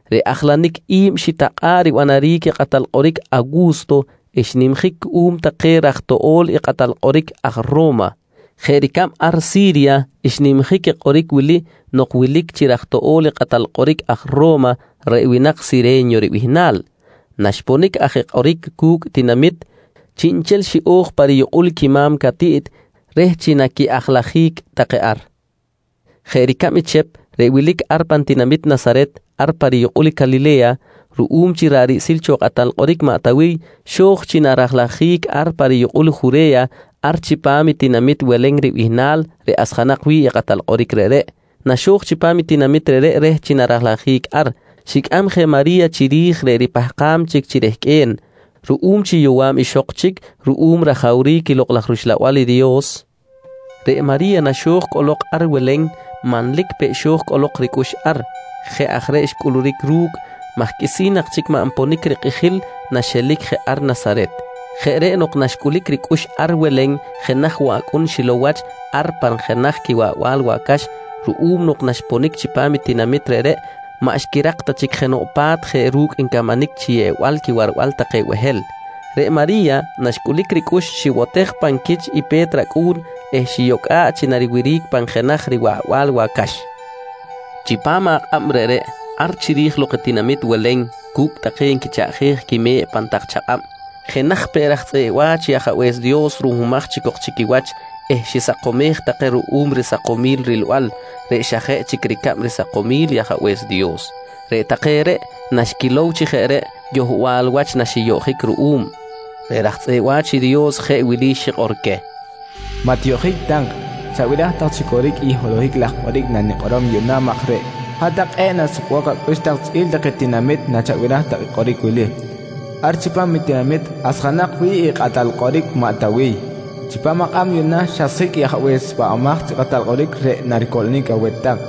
Reꞌ ajlanic i̱b xitakꞌa̱ꞌ ribanaric i kꞌatal kꞌoric Awu̱sto, xnimjic cuꞌum take raj toꞌbonel i kꞌatal kꞌoric aj Ro̱ma. Jeꞌ ricab ar Si̱rya, xnimjic i kꞌoric wili nok wilic chi raj toꞌbonel i kꞌatal kꞌoric aj Ro̱ma reꞌ winak Sire̱nyo ribihnal. Naxponic aj i kꞌoric cu̱cꞌ tinamit, chiꞌnchel xiꞌo̱j pa riyukꞌul quima̱m catiꞌt reh chi naqui-ajlajic take ar. Jeꞌ ricab i Chep reꞌ wilic ar pan tinamit Nasaret ar pa riyukꞌul Calile̱ya, ruꞌum chi ra̱ꞌ riꞌsil cho i kꞌatal kꞌoric maꞌ Tawiy xo̱j chi narajlajic ar pa riyukꞌul i Jure̱ya ar chipam i tinamit Welen ribihnal reꞌ asjanak wi̱ꞌ i kꞌatal kꞌoric reꞌreꞌ. Naxo̱j chipam i tinamit reꞌreꞌ reh chi narajlajic ar, xicꞌam je i Mari̱ya chiri̱j reꞌ ripahkam chic chi rehqꞌue̱n. Ruꞌum chi yowa̱b ixok chic ruꞌum rajawric i Lokꞌ laj rUxlabal i Dios, reꞌ Mari̱ya naxiponic ar Welen, manlic peꞌ xo̱j cꞌolok ricꞌux ar. Jeꞌ aj reꞌ xcꞌuluric ru̱cꞌ maj qꞌuisi̱n nak chic maꞌ nponic rikꞌijil naxelic je ar Nasaret. Jeꞌ reꞌ nok naxcꞌulic ricꞌux ar Welen, jenaj woꞌ acꞌun xilow wach ar pan jenaj quiwarbal wacax ruꞌum nok naxiponic chipam i tinamit reꞌreꞌ maꞌ xquirak ta chic jenoꞌ pa̱t jeꞌ ru̱cꞌ ncamanic chi yeꞌbal quiwarbal take behel. Reꞌ Mari̱ya naxcꞌulic ricꞌux, xibotej pan quich i pe̱t racꞌu̱n eh xiyocꞌa̱ꞌ chi nariwiric pan jenaj riwaꞌbal wacax. Chipam akꞌab reꞌreꞌ, ar chiri̱j lok i tinamit Welen cu̱cꞌ take nquichaꞌjej quime̱ꞌ pan tak chakꞌab, jenaj peꞌ raj tzꞌeꞌ wa̱ch i Ajabe̱s Dios ruhmumaj chic cok chi quiwach eh xisakomjic take ruꞌum risakomil rilbal reꞌ xa jeꞌ chic ricab risakomil i Ajabe̱s Dios. Reꞌ take reꞌ naxquilow chi jeꞌ reꞌ, yohbal wach naxiyoꞌjic ruꞌum. Reꞌ raj tzꞌeꞌ wa̱ch i Dios jeꞌ wili xikꞌor queh: «Maꞌ tiyoꞌjic tak. Chabiraj tak chi coric i holohic laj kꞌoric nanikꞌorom yuꞌna maj reꞌ hat-tak kꞌe̱ꞌ nasukbok acꞌux tak chꞌi̱l take tinamit nachabiraj tak i kꞌoric wili: Ar chipam i tinamit asjanak wi̱ꞌ i kꞌatal kꞌoric maꞌ Tawiy, chipam akꞌab yuꞌna xasjic i Ajabe̱s Pahbamaj chi Kꞌatal Kꞌoric reꞌ naricoꞌlonic aweh tak.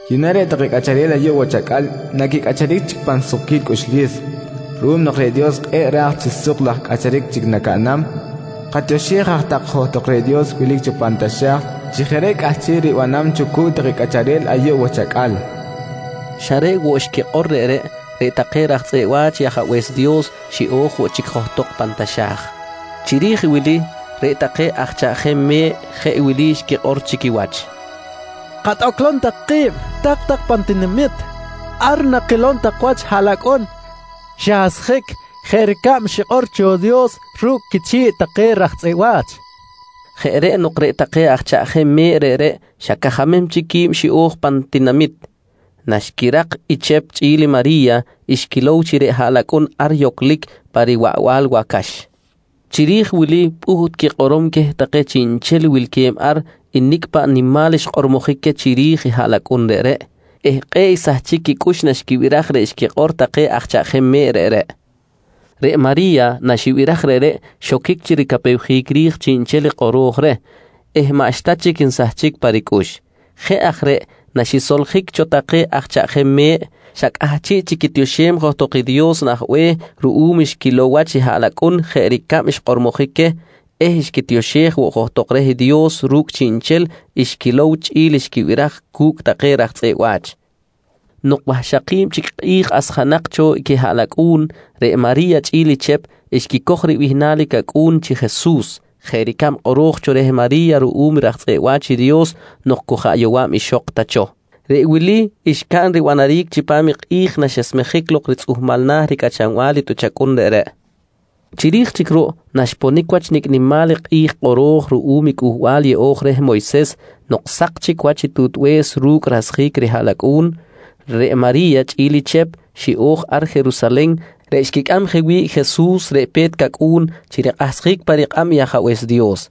«Yuꞌna reꞌ take cꞌacharel ayuꞌ wach acꞌal naquicꞌacharic chic pan sukquil cꞌuxlis, ruꞌum nok reꞌ Dios kꞌe̱ꞌ raj chi suk laj cꞌacharic chic nacaꞌnam. Katioxej aj tak johtok reh Dios wilic cho pan taxa̱j chi jeꞌ reꞌ cꞌahchiꞌ ribanam cho cu̱cꞌ take cꞌacharel ayuꞌ wach acꞌal, nqui take. Xa reꞌ woꞌ xquikꞌor reꞌreꞌ, reꞌ take raj tzꞌeꞌ wa̱ch i Ajabe̱s Dios xiꞌo̱j woꞌ chic johtok pan taxa̱j. Chiri̱j wili reꞌ take aj chaꞌjem me̱ꞌ jeꞌ wili xquikꞌor chi quiwach: «Katꞌoclom tak ki̱b, tak-tak pan tinamit. Ar nakilom tak wach i haꞌlacꞌun xasjic jeꞌ ricab xikꞌor i Dios ru̱cꞌ quichi̱ꞌ take raj tzꞌeꞌ wa̱ch, nqui take. Jeꞌ reꞌ nok reꞌ take aj chaꞌjem me̱ꞌ reꞌreꞌ xa cajamem chic qui̱b xiꞌo̱j pan tinamit. Naxquirak i Chep chꞌi̱l i Mari̱ya, xquilow chi reꞌ haꞌlacꞌun ar yoclic pa riwaꞌbal wacax. Chiri̱j wili pꞌuht quikꞌorom queh take chiꞌnchel wilque̱b ar i nicꞌ paꞌ nimal xkꞌormojic queh chiri̱j i haꞌlacꞌun reꞌreꞌ eh kꞌe̱ꞌ xsahchic quicꞌux naxquibiraj reꞌ xquikꞌor take aj chaꞌjem me̱ꞌ reꞌreꞌ. Reꞌ Mari̱ya, naxibiraj reꞌreꞌ, xoquic chi ricapewjic ri̱j chiꞌnchel i kꞌoro̱j reh eh maꞌxta chic nsahchic pa ricꞌux. Jeꞌ aj reꞌ naxisoljic cho take aj chaꞌjem me̱ꞌ, xa cꞌahchiꞌ chic quitioxem johtok i Dios nah be̱h ruꞌum xquilow wach i haꞌlacꞌun jeꞌ ricab xkꞌormojic queh eh xquitioxej woꞌ johtok reh i Dios ru̱cꞌ chiꞌnchel xquilow chꞌi̱l xquibiraj cu̱cꞌ take raj tzꞌeꞌ wa̱ch. Nok wahxaki̱b chic kꞌi̱j asjanak cho i quihaꞌlacꞌu̱n, reꞌ Mari̱ya chꞌi̱l i Chep xquicoj ribihnal i cacꞌu̱n chi Jesus, jeꞌ ricab kꞌoro̱j cho reh Mari̱ya ruꞌum raj tzꞌeꞌ wa̱ch i Dios nok cu jaꞌ yowa̱b ixok ta cho. Reꞌ wili xcaꞌn ribanaric chipam i kꞌi̱j naxesmejic lok ritzꞌuhmal na̱ ricꞌachanbal i tꞌuch acꞌun reꞌreꞌ. Chiri̱j chic ruꞌ naxponic wach nicꞌ nimal i kꞌi̱j kꞌoro̱j ruꞌum i Cꞌuhbal Yeꞌo̱j reh Moyses nok sak chic wach i tutbe̱s ru̱cꞌ rasjic rihaꞌlacꞌu̱n, reꞌ Mari̱ya chꞌi̱l i Chep xiꞌo̱j ar Jerusalen reꞌ xquicꞌam je wi̱ꞌ i Jesus reꞌ pe̱t cacꞌu̱n, chi rikꞌahsjic pa rikꞌab i Ajabe̱s Dios.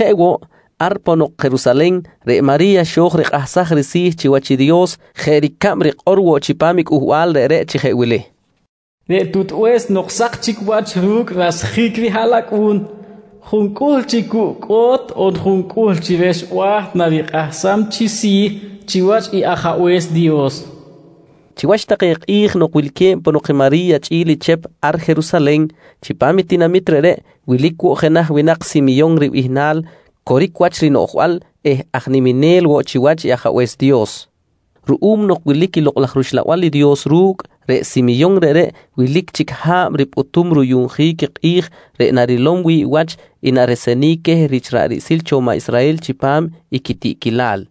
Jeꞌ woꞌ, ar ponok Jerusalen, reꞌ Mari̱ya xo̱j rikꞌahsaj risi̱ chiwach i Dios jeꞌ ricab rikꞌor woꞌ chipam i Cꞌuhbal reꞌreꞌ chi jeꞌ wili: “Reꞌ tutbe̱s nok sak chic wach ru̱cꞌ rasjic rihaꞌlacꞌu̱n, juncꞌuhl chi cucꞌ cꞌo̱t on juncꞌuhl chi rexba̱ narikꞌahsam chi si̱ chiwach i Ajabe̱s Dios, nqui rikꞌor. Chiwach take kꞌi̱j nok wilque̱b ponok i Mari̱ya chꞌi̱l Chep ar Jerusalen, chipam i tinamit reꞌreꞌ wilic woꞌ jenaj winak Simyon ribihnal coric wach rinoꞌjbal eh aj niminel woꞌ chiwach i Ajabe̱s Dios. Ruꞌum nok wilic i Lokꞌ laj rUxlabal i Dios ru̱cꞌ, reꞌ Simyon reꞌreꞌ wilic chic ha̱b ripꞌutum ruyuꞌnjic i kꞌi̱j reꞌ narilom wi̱ꞌ wach i naresenic queh rich ra̱ꞌ riꞌsil cho maꞌ Israhel chipam quitiꞌquilal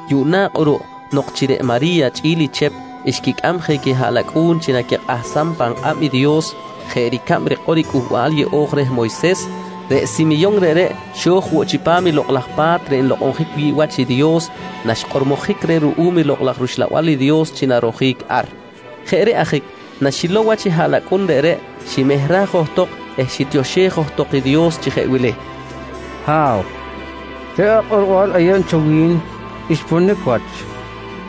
Yuꞌna kꞌuruꞌ nok chi reꞌ Mari̱ya chꞌi̱l Chep xquicꞌam je quihaꞌlacꞌu̱n chi naquikꞌahsam pan kꞌab i Dios, jeꞌ ricab rikꞌor i Cꞌuhbal Yeꞌo̱j reh Moyses, reꞌ Simyon reꞌreꞌ xo̱j woꞌ chipam Lokꞌ laj Pa̱t reꞌ nlokꞌonjic wi̱ꞌ wach i Dios, naxkꞌormojic reh ruꞌum Lokꞌ laj rUxlabal i Dios chi narojic ar. Jeꞌ reꞌ ajic, naxilow wach i haꞌlacꞌun reꞌreꞌ, ximehraj johtok eh xitioxej johtok i Dios chi jeꞌ wili: «Ha̱w, reꞌ akꞌorbal ayeb cho wi̱n xponic wach.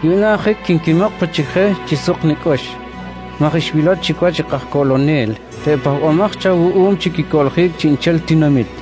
Yuꞌna ajic quinquimok pe chic je chi suk nicꞌux, maj xwilow chic wach i kajcoꞌlonel reꞌ pahbamaj cho awuꞌum chi quicoꞌljic chiꞌnchel i tinamit.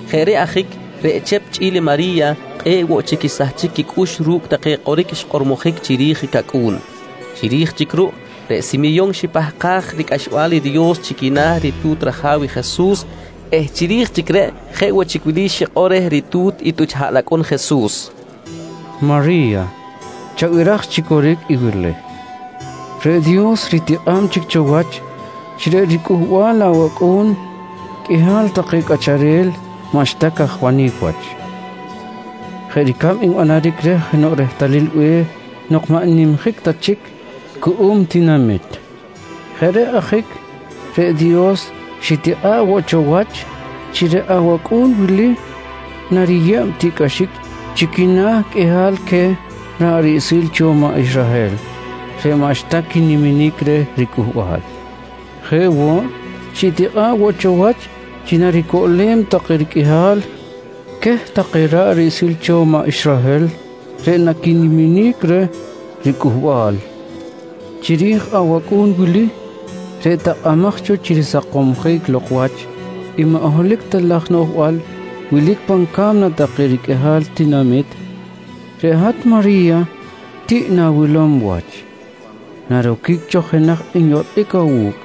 Jeꞌ reꞌ ajic reꞌ Chep chꞌi̱l i Mari̱ya kꞌe̱ꞌ woꞌ chic xsahchic quicꞌux ru̱cꞌ take kꞌoric xkꞌormojic chiri̱j i cacꞌu̱n. Chiri̱j chic ruꞌ, reꞌ Simyon xipahkaj ricꞌaxbal i Dios chi quina̱ ritu̱t raja̱w i Jesus eh chiri̱j chic reꞌ jeꞌ woꞌ chic wili xikꞌor reh ritu̱t i tꞌuch haꞌlacꞌun Jesus: «Mari̱ya, chabiraj chi coric i wili: Reꞌ Dios ritikꞌa̱b chic cho wach chi reꞌ ricꞌuhbal awacꞌu̱n qꞌuihal take cꞌacharel maꞌxta cajwanic wach, jeꞌ ricab nbanaric reh jenoꞌ rehtalil be̱h nok maꞌ n-nimjic ta chic cuꞌum tinamit. Jeꞌ reꞌ ajic reꞌ Dios xitikꞌa̱ꞌ woꞌ cho wach chi reꞌ awacꞌu̱n wili nariyeb tiꞌcꞌaxic chi quina̱ qꞌuihal queh ra̱ꞌ riꞌsil cho maꞌ Israhel reꞌ maꞌxta quiniminic reh ricꞌuhbal. Jeꞌ woꞌ, xitikꞌa̱ꞌ woꞌ cho wach chi naricoꞌlem take riqꞌuihal queh take ra̱ꞌ riꞌsil cho maꞌ Israhel reꞌ naquiniminic reh ricꞌuhbal. Chiri̱j awacꞌu̱n wili, reꞌ takꞌamaj cho chi risakomsjic lok wach i maꞌ holohic ta laj noꞌjbal wilic pan ca̱mna take riqꞌuihal tinamit, reꞌ hat Mari̱ya tiꞌ na̱wilom wach. Naroquic cho jenaj nyotꞌic awu̱cꞌ,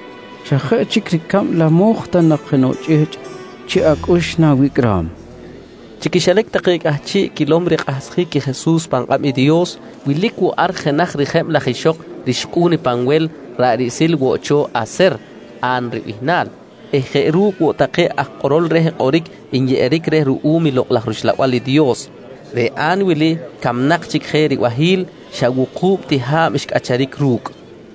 xa jeꞌ chic ricab lamoj ta nak jenoꞌ chꞌihchꞌ chiꞌ acꞌux na̱wicꞌram, nqui Simyon. Chi quixilac take cꞌahchiꞌ quilom rikꞌahsjic i Jesus pan kꞌab i Dios, wilic woꞌ ar jenaj rijeb laj ixok rixkꞌu̱n i Panwel ra̱ꞌ riꞌsil woꞌ cho Aser, A̱n ribihnal eh jeꞌ ru̱cꞌ woꞌ take aj kꞌoro̱l reh kꞌoric nyeꞌeric reh ruꞌum Lokꞌ laj rUxlabal i Dios. Reꞌ A̱n wili camnak chic je ribahi̱l, xa wuku̱b ti ha̱b xcꞌacharic ru̱cꞌ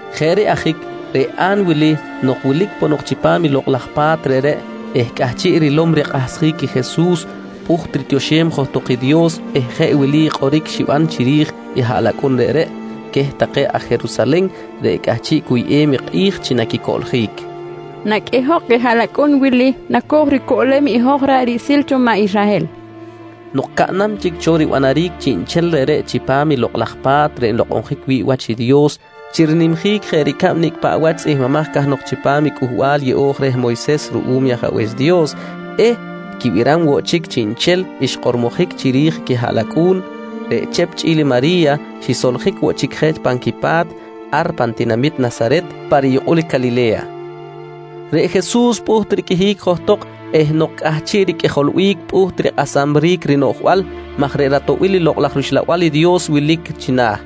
Jeꞌ reꞌ ajic reꞌ A̱n wili nok wilic ponok chipam lokꞌ laj pa̱t reꞌreꞌ eh cꞌahchiꞌ rilom rikꞌahsjic i Jesus, pꞌuht ritioxem johtok i Dios eh jeꞌ wili kꞌoric xiban chiri̱j i haꞌlacꞌun reꞌreꞌ queh take aj Jerusalen reꞌ cꞌahchiꞌ cuyꞌem i kꞌi̱j chi naquicoꞌljic: «Naqꞌuihok i haꞌlacꞌun wili naco̱j ricoꞌlem i hoj ra̱ꞌ riꞌsil cho maꞌ Israhel, nqui kꞌoric xiban. Nok caꞌnam chic cho ribanaric chiꞌnchel reꞌreꞌ chipam Lokꞌ laj Pa̱t reꞌ nlokꞌonjic wi̱ꞌ wach i Dios chi rinimjic jeꞌ ricab nicꞌ paꞌ wach tzꞌihmbimaj cahnok chipam i Cꞌuhbal yeꞌo̱j reh Moyses ruꞌum i Ajabe̱s Dios eh quibiram woꞌ chic chiꞌnchel xkꞌormojic chiri̱j i quihaꞌlacꞌu̱n, reꞌ Chep chꞌi̱l Mari̱ya xisoljic woꞌ chic je pan quipa̱t ar pan tinamit Nasaret pa riyukꞌul i Calile̱ya. Reꞌ Jesus pꞌuht riqꞌuihic johtok eh nok cꞌahchiꞌ riqꞌuijolbic pꞌuht rikꞌasamric rinoꞌjbal maj reꞌ ratoꞌbil i Lokꞌ laj rUxlabal i Dios wilic china̱.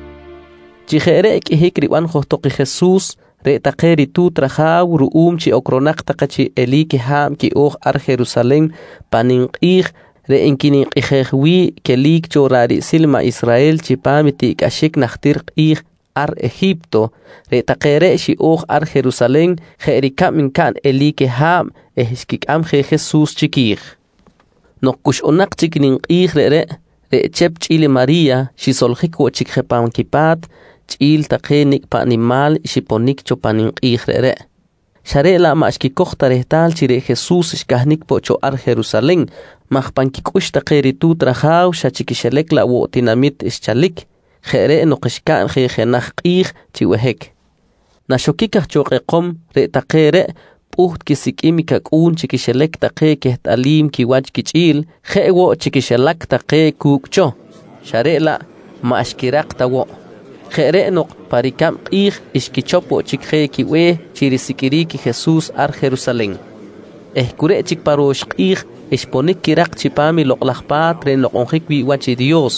Chi jeꞌ reꞌ qꞌuihic riban johtok i Jesus, reꞌ take ritu̱t raja̱w ruꞌum chi ocronak take chi eli̱c ha̱b quiꞌo̱j ar Jerusalen pan ninkꞌi̱j reꞌ nquininkꞌijej wi̱ꞌ i quelic cho ra̱ꞌ riꞌsil maꞌ Israhel chipam i tiꞌcꞌaxic najtir kꞌi̱j ar Eji̱pto, reꞌ take reꞌ xiꞌo̱j ar Jerusalen jeꞌ ricab ncaꞌn eli̱c ha̱b eh xquicꞌam je Jesus chiqui̱j. Nok cuxꞌunak chic i ninkꞌi̱j reꞌreꞌ, reꞌ Chep chꞌi̱l Mari̱ya xisoljic woꞌ chic je pan quitinami̱t chꞌi̱l take nicꞌ paꞌ nimal xiponic cho pan ninkꞌi̱j reꞌreꞌ, xa reꞌ laꞌ maꞌ xquicoj ta rehtal chi reꞌ Jesus xcahnic poꞌ cho ar Jerusalen maj pan quicꞌux take ritu̱t raja̱w, xa chi quixilac laꞌ woꞌ tinamit xchalic. Jeꞌ reꞌ nok xcaꞌn je jenaj kꞌi̱j chi behic. Naxoquic aj cho kꞌekom, reꞌ take reꞌ pꞌuht quisiqꞌuim i cacꞌu̱n chi quixilac take quehtꞌalim quiwach quichꞌi̱l, jeꞌ woꞌ chi quixilac take cu̱cꞌ cho, xa reꞌ laꞌ maꞌ xquirak ta woꞌ. Jeꞌ reꞌ nok pa ricab kꞌi̱j xquichop woꞌ chic je quibe̱h chi risiqꞌuiric i Jesus ar Jerusalen eh cu reꞌ chic pa ro̱x kꞌi̱j xponic quirak chipam Lokꞌ laj Pa̱t reꞌ nlokꞌonjic wi̱ꞌ wach i Dios.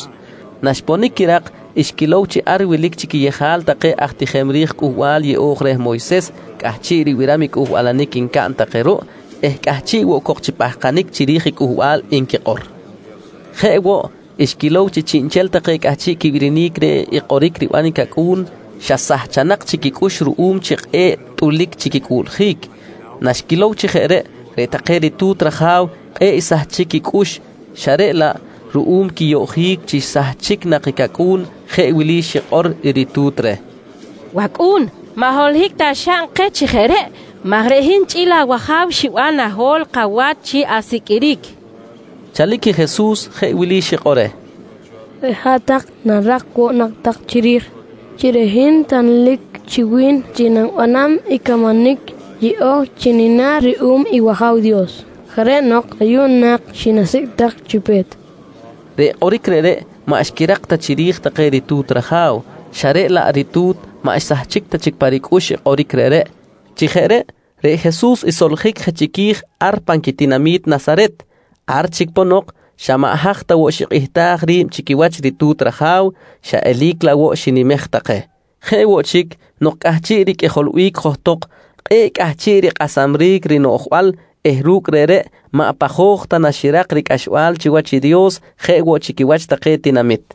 Naxponic quirak, xquilow chi ar wilic chi quiyejal take aj tijem ri̱j Cꞌuhbal Yeꞌo̱j reh Moyses cꞌahchiꞌ ribiram i cꞌuhbalanic ncaꞌn take ruꞌ eh cꞌahchiꞌ woꞌ cok chi pahkanic chiri̱j i cꞌuhbal nquikꞌor. Jeꞌ woꞌ, xquilow chi chiꞌnchel take cꞌahchiꞌ quibirinic reh kꞌoric riban i cacꞌu̱n, xa sahchanak chic quicꞌux ruꞌum chi kꞌe̱ꞌ tꞌulic chi quicꞌuꞌljic. Naxquilow chi jeꞌ reꞌ take ritu̱t raja̱w, kꞌe̱ꞌ xsahchic quicꞌux xa reꞌ laꞌ ruꞌum quiyoꞌjic chi xsahchic nak i cacꞌu̱n jeꞌ wili xikꞌor i ritu̱t reh: «Wacꞌu̱n, maꞌ holohic ta xaꞌn keh chi jeꞌ reꞌ maj reꞌ hin chꞌi̱l awaja̱w xiban naho̱l kawach chi asiqꞌuiric, nqui reh. Chalic Jesus jeꞌ wili xikꞌor reh: «Reꞌ hat-tak narak woꞌ nak tak chiri̱j chi reꞌ hin tanlic chi wi̱n chi nanibanam i camanic yeꞌo̱j chi nina̱ ruꞌum i wAja̱w Dios. Jeꞌ reꞌ nok ayuꞌ nak xinasicꞌ tak chi pe̱t, nqui xikꞌor. Reꞌ kꞌoric reꞌreꞌ maꞌ xquirak ta chiri̱j take ritu̱t raja̱w xa reꞌ laꞌ reꞌ ritu̱t maꞌ xsahchic ta chic pa ricꞌux i kꞌoric reꞌreꞌ. Chi jeꞌ reꞌ, reꞌ Jesus xsoljic je chiqui̱j ar pan quitinami̱t Nasaret. Ar chic ponok xa maꞌ haj ta woꞌ xikꞌihtaj ri̱b chiwach ritu̱t raja̱w, xa eli̱c laꞌ woꞌ xinimej take. Jeꞌ woꞌ chic, nok cꞌahchiꞌ riqꞌuijolbic johtok, kꞌe̱ꞌ cꞌahchiꞌ rikꞌasamric rinoꞌjbal eh ru̱cꞌ reꞌreꞌ, maꞌ pajoj ta naxirak ricꞌaxbal chiwach i Dios jeꞌ woꞌ chi quiwach take tinamit.